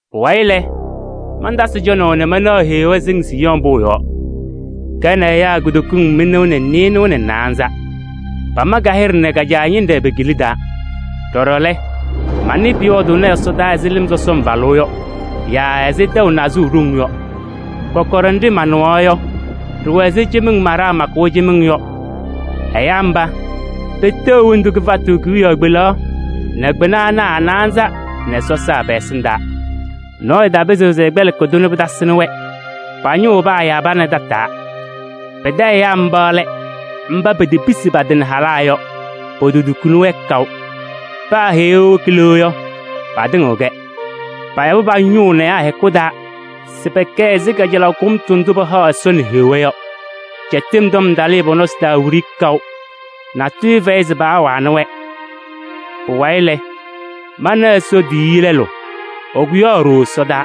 Pʋwayɩ lɛ, mantasɩ cɔnaʋ nɛ manaɣ Heɣa sɩŋ Siiyɔɔ pʋʋ yɔɔ, ka nɛ ɛyaa kutokiŋ mɩnʋʋ nɛ nɩɩnaza nɛ naanza. Pama ka-hɩɖɛ nɛ ka-Caa ñɩnɖɛ pe-kila taa. Ɖɔɖɔ lɛ, manɩ pʋyɔɔdʋʋnɩ ɛsɔdaa ɛzɩ lɩm sɔsɔm falʋʋ yɔ yaa ɛzɩ tɛʋ nazʋʋʋ ɖoŋ yɔ. Kɔkɔɖɛ nɖɩ manɩɣaɣ yɔ, ɖɩwɛ ɛzɩ cɩmɩŋ maɖaa makʋʋ cɩmɩŋ yɔ. Ɛyaa mba, peteɣ hendu kɩfatʋ kewiyaɣ kpelaɣ nɛ kpɩna ana a-naanza nɛ sɔsaa pɛ-ɛsɩndaa. Nɔɔyʋ tapɩzɩɣ se ɛkpɛlɩkɩ-tʋ nɛ pɩtasɩnɩ-wɛ. Pa-ñʋʋ paayabɩnɩ tataa. Pɩtɛ ɛyaa mba lɛ mba petepisi pa-tɩ nɛ halaa yɔ, pototukuni-wɛ kaʋ. Paa Heɣa ewoki le yɔ, patɩŋɩɣ-kɛ. Payabɩ pa-ñʋʋ nɛ ɛyaa hɛkʋ taa se pɛkɛ ɛzɩ kajalaɣ kʋmtʋ ndʋ pahaɣ Ɛsɔ nɛ Heɣa yɔ. Cɛtɩm tɔm talɩɩ pɔ-nɔsɩ taa wiɖiyi kaʋ, natʋyʋ fɛyɩ se paawanɩ-wɛ. Pʋwayɩ lɛ, mana Ɛsɔ tiyiyu lɛlʋ, ɛkʋyaɣ ɖooo ɛsɔdaa.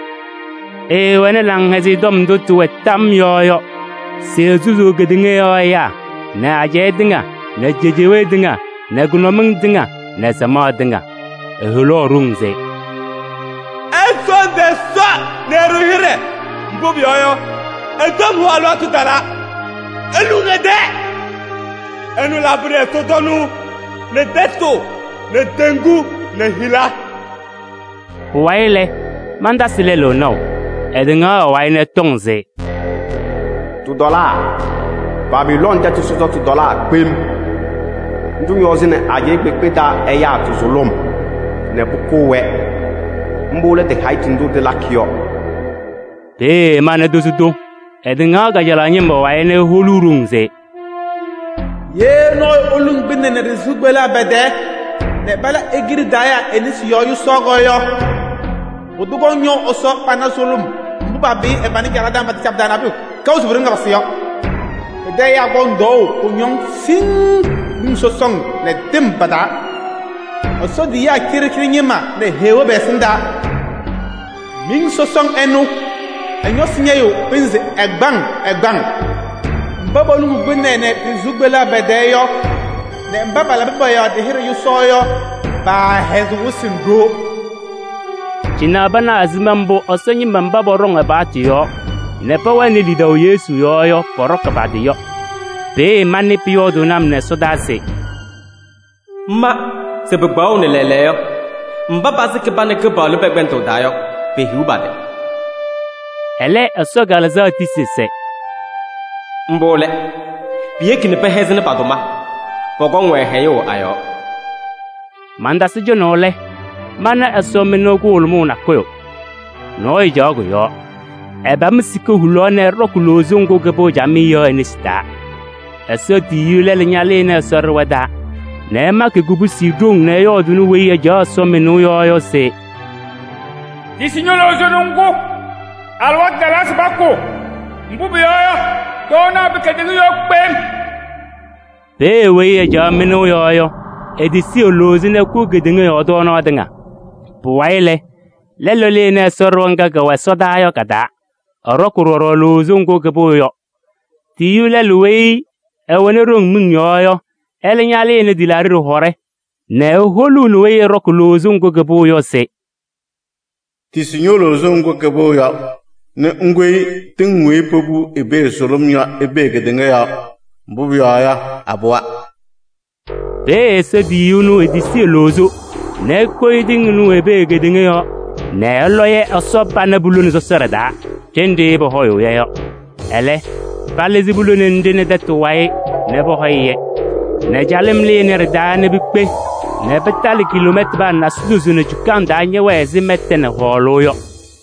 Ɛɛwɛnɩ Laŋhɛzɩyɛ Tɔm ndʋ tɩwɛ tam yɔɔ yɔ se esusuu kedeŋa yɔɔ ɛyaa nɛ ajɛɛ tɩŋa nɛ cejewee tɩŋa nɛ kʋnʋmɩŋ tɩŋa nɛ samaɣ tɩŋa. Eholaɣ ɖoŋ se: “Ɩsɔɔndɩ Ɛsɔ nɛ ɩɖʋ-ɩ hɩɖɛ, mbʋ pʋyɔɔ yɔ, ɛ-tɔm hʋʋ alɩwaatʋ talaa. Iluŋ ɛ-tɛɛ! Ɛnʋ labɩnɩ ɛsɔtɔnʋʋ nɛ tɛtʋ nɛ teŋgu nɛ hila.” Pʋwayɩ lɛ, mantasɩ lɛlʋ naʋ, ɛtɩŋaɣ ɛ-wayɩ nɛ ɛtɔŋ se: “Tɩtɔlaa! Babilooni tɛtʋ sɔsɔtʋ tɔlaa kpem! Ndʋ ñɔzɩnɩ ajɛɛ kpeekpe taa ɛyaa tɩ-sʋlʋm nɛ pʋkʋʋ-wɛ, mbʋ lɛ tɩ-hayitu ndʋ tɩlakɩ yɔ.” Peeye mana tozo tʋ, ɛtɩŋaɣ kajalaɣ ñɩma wayɩ nɛ eholuu ɖoŋ se: “Ye nɔɔyʋ eluŋ kpɩnɛ nɛ ɖɩ-sɩʋ kpeleɣ pɛ-tɛɛ nɛ pala e-kiɖe taa yaa e-nesi yɔɔ yʋsaɣ yɔ, pʋdʋ kɔŋ ñɔʋ Ɛsɔ pana sʋlʋm mbʋ papɩyɩ ɛ-pana caɖaɣ taa nɛ pataca pɩ-taa pʋyʋ kaʋ se pu-ɖoŋ ɛpasɩ yɔ: pɩtɛ ɛyaa kɔŋ tɔɔʋ kʋñɔŋ siŋŋ miŋ sɔsɔŋ nɛ tɩm pa-taa, Ɛsɔ tiyiyaa cɩɖɩcɩɖɩ ñɩma nɛ Heɣa pɛ-ɛsɩndaa. Miŋ sɔsɔŋ ɛnʋ, ɛ-ñɔsɩ ñɛyɩɣ pɩnzɩ ɛgbaŋ ɛgbaŋ. Mba poluŋuu kpɩnɛ nɛ ɖɩ-sɩʋ kpeleɣ pɛ-tɛɛ yɔ nɛ mba palabɩ pɔ-yɔɔ ɖɩ-hɩɖɛ yʋsaɣ yɔ, paahɛzɩɣ wɩsɩ nɛ ɖoo.” Cɩnɛ panaɣ ɛzɩma mbʋ Ɛsɔ ñɩma mba pɔɖɔŋ ɛ-paɣtʋ yɔɔ nɛ pɛwɛnɩ lidaʋ Yesu yɔɔ yɔ pɔɖɔkɩ pa-tɩ yɔ. Peeye manɩ pʋyɔɔdʋʋnɩ-m nɛ ɛsɔdaa se: “Ma se pɩkpaɣʋnɩ lɛɛlɛɛyɔ yɔ, mba pasɩkɩ pa nɛ Kɩpaɣlʋ pɛ-kpɛndʋʋ taa yɔ, pehiɣ pa-tɩ!” Ɛlɛ Ɛsɔ Kalɩzaɣ tisi se: “Mbʋ lɛ! Piyeki nɛ pɛhɛzɩnɩ pa-tʋma: pɔkɔŋ-wɛ hɛyʋʋ a-yɔɔ.” Mantasɩ cɔnaʋ lɛ, mana ɛsɔmɩnʋʋ kʋhʋlʋmʋʋ nakʋyʋ. Nɔɔyʋ caɣ kʋ-yɔɔ, ɛpam sika hulaɣ nɛ ɛɖɔkɩ loozo ŋgʋ kɩpɩɣ camɩyɛ yɔ e-nesi taa. Ɛsɔ tiyiyu lɛlʋ ñalɩnɩ Ɛsɔ ɖɩɣa taa nɛ ɛmakɩ kubusi ɖoŋ nɛ ɛyɔɔdʋʋnɩ weyi ɛcaɣ ɛsɔmɩnʋʋ yɔɔ yɔ se: “Tisi ño-loozo nɛ ŋkʋ. Alɩwaatʋ talaa se pakʋ, mbʋ pʋyɔɔ yɔ, tɔɔnaɣ pɩ kedeŋa yɔɔ kpem!” Peeye weyi ɛcaɣ mɩnʋʋ yɔɔ yɔ, etisi e-loozo nɛ ɛkʋ kedeŋa yɔɔ tɔɔnaɣ tɩŋa. Pʋwayɩ lɛ, lɛlʋ lɩnɩ Ɛsɔ ɖɩɣa ŋga kɛwɛ ɛsɔdaa yɔ ka-taa, ɛɖɔkɩ ɖɔɖɔ loozo ŋgʋ kɩpɩɣ yɔ. Tiyiyu lɛlʋ weyi ɛwɛnɩ ɖoŋ miŋ yɔɔ yɔ, ɛlɛ ñalɩnɩ tɩlaaɖɩ ɖɩhɔɖɛ nɛ eholuuni weyi ɛɖɔkɩ loozo ŋgʋ kɩpɩɣ yɔ se: “Tisi ño-loozo ŋgʋ kɩpɩɣ yɔ nɛ ŋkoyi tɩŋ weyi popuu i-pee sʋlʋm yɔ i-pee kedeŋa yɔɔ, mbʋ pʋyɔɔ yɔ, apɩwa.” Peeye Ɛsɔ tiyiyu ɛnʋ etisi e-loozo nɛ ekoyi tɩŋ ɩnʋ i-pee kedeŋa yɔɔ nɛ ɛlɔ-yɛ Ɛsɔ pana pulone sɔsɔɖɛ taa ɖenɖe pɔhɔyʋʋ-yɛ yɔ. Ɛlɛ palɩzɩ pulone nɖɩ nɛ tɛtʋ wayɩ nɛ pɔhɔyɩ-yɛ nɛ calɩm lɩnɩ ɖɩ-taa nɛ pikpe nɛ pɩtalɩ kiloomɛtanaa nasidozo nɛ cukaŋ taa ñɛwɛ ɛzɩ mɛta nɛ hɔɔlʋʋ yɔ.